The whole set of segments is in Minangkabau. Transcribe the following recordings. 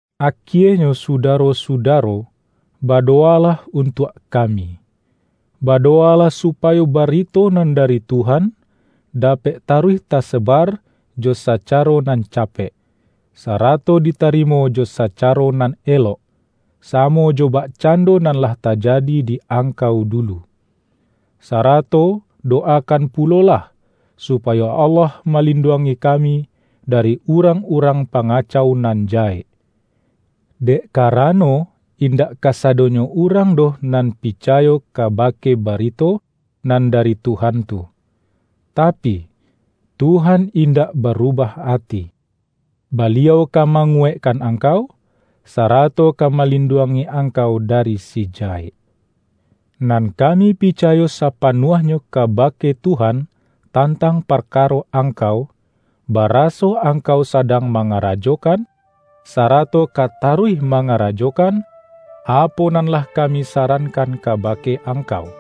Akienyo sudaro-sudaro, badowa-lah untuak kami. Badowalah su-payo barito nan dari Tuhan, dapek taruih tasebar jo sacaro nan capek, sarato ditarimo jo sacaro nan elok, samo jo bakcando nan lah tajadi di angkau dulu. Sarato dowakan pulo-lah, supayo Allah malinduangi kami dari urang-urang pangacau nan ja-hek. Dek karano, indak kasadonyo urang doh nan picayo kabake barito nan dari Tuhan tu. Tapi, Tuhan indak barubah ati. Baliau ka manguwaikkan angkau, sa-rato ka malinduangi angkau dari Si Jahek. Nan kami picayo sapanuah-nyo kabake Tuhan tantang parkaro angkau, baraso angkau sadang ma-ngarajokan, sarato ka taruih manga-rajokan, apo nan lah kami sarankan kabake angkau.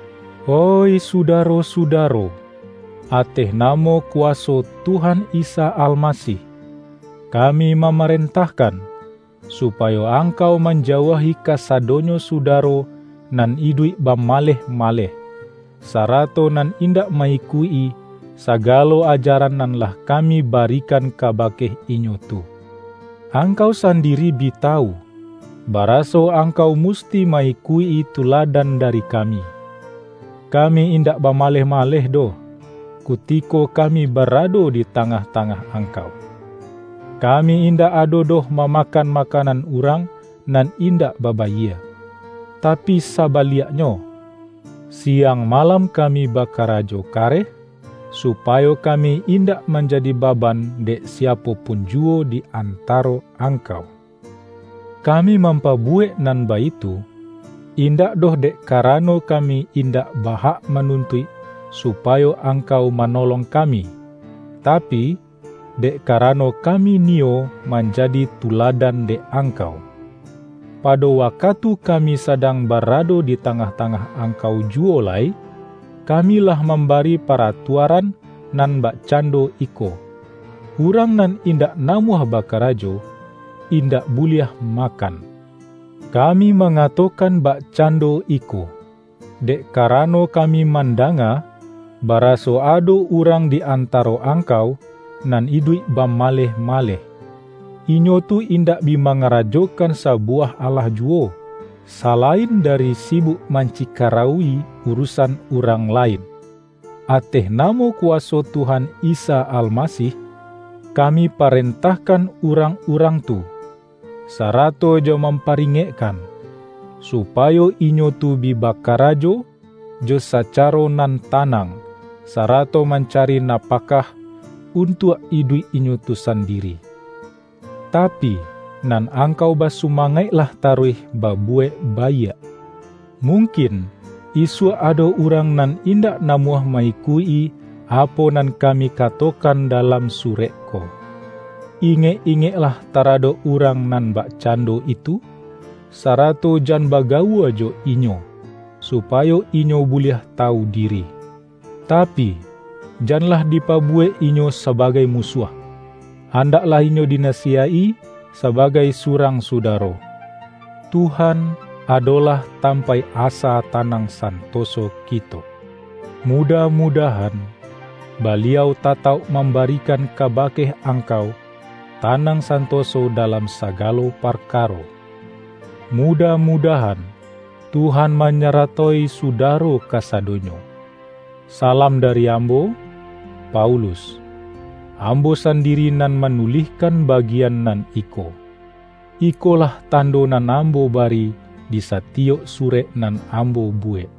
Oih sudaro-sudaro, ateh namo ku-waso Tuhan Isa Almasih, kami ma-marentahkan, supayo angkau man-jauahi kasadonyo sudaro nan iduik bamaleh-maleh, sarato nan indak ma-ikuik-i sagalo ajaran nan lah ka-mi barikan kabake inyo tu. Angkau sandiri bi tawu, baraso angkau mus-ti ma-ikuik-i tuladan dari kami. Ka-mi indak bamaleh-maleh doh, kutiko kami barado di tangah-tangah ang-kau. Kami indak ado doh mamakan makanan urang nan indak babayie. Tapi sabaliaknyo, siang malam kami bakarajo kareh, supayo kami indak manjadi baban dek siapo pun juwo di antaro angkau. Kami mampabuwek nan baitu, indak doh dek karano ka-mi indak ba-hak manuntuik supayo angkau manolong kami, tapi, dek ka-rano kami niyo manjadi tuladan dek angkau. Pado wakatu kami sadang barado di tangah-tangah angkau ju-wo lai, kami lah mambari paratua-ran nan bakcando iko,”Urang nan in-dak namuah bakarajo, indak buliah makan.” Kami mangatokan bakcando iko, dek karano kami mandanga, bara-so ado urang di antaro angkau nan iduik bamaleh-maleh. Inyo tu indak bi mangarajokan sabuwah alah juwo, salain dari sibuk mancikarauwi uru-san urang lain. Ateh namo kuwaso Tuhan Isa Almasih, kami parentah-kan urang-urang tu, sarato jo mam-paringekkan, supayo inyo tu bi ba-karajo jo sacaro nan tanang, sarato mancari napakah untuak iduik inyo tu sandiri. Tapi, nan angkau basumangaik-lah taruih babuwek baiak. Mung-kin, isuak ado urang nan indak namuah ma-ikuik-i apo nan kami ka-tokan dalam surek ko. Ingek-ingek-lah taradok urang nan bakcando itu, sarato jan bagawua jo inyo, supayo inyo buliah tawu diri. Tapi, janlah dipabuwek inyo sabagai musuah; an-daklah inyo dinasiyaik-i sabagai su-rang sudaro. Tuhan, adolah tampaik asa tanang santoso kito. Mudah-mudahan, Baliau tatauk mambarikan kabake angkau, ta-nang santoso dalam sagalo parkaro. Mu-dah-mudahan, Tuhan manyaratoi suda-ro kasadonyo. Salam dari ambo, Paulus. Ambo sandiri nan manulihkan bagian nan iko. Ikolah tando nan ambo bari di satiyok surek nan ambo buwek.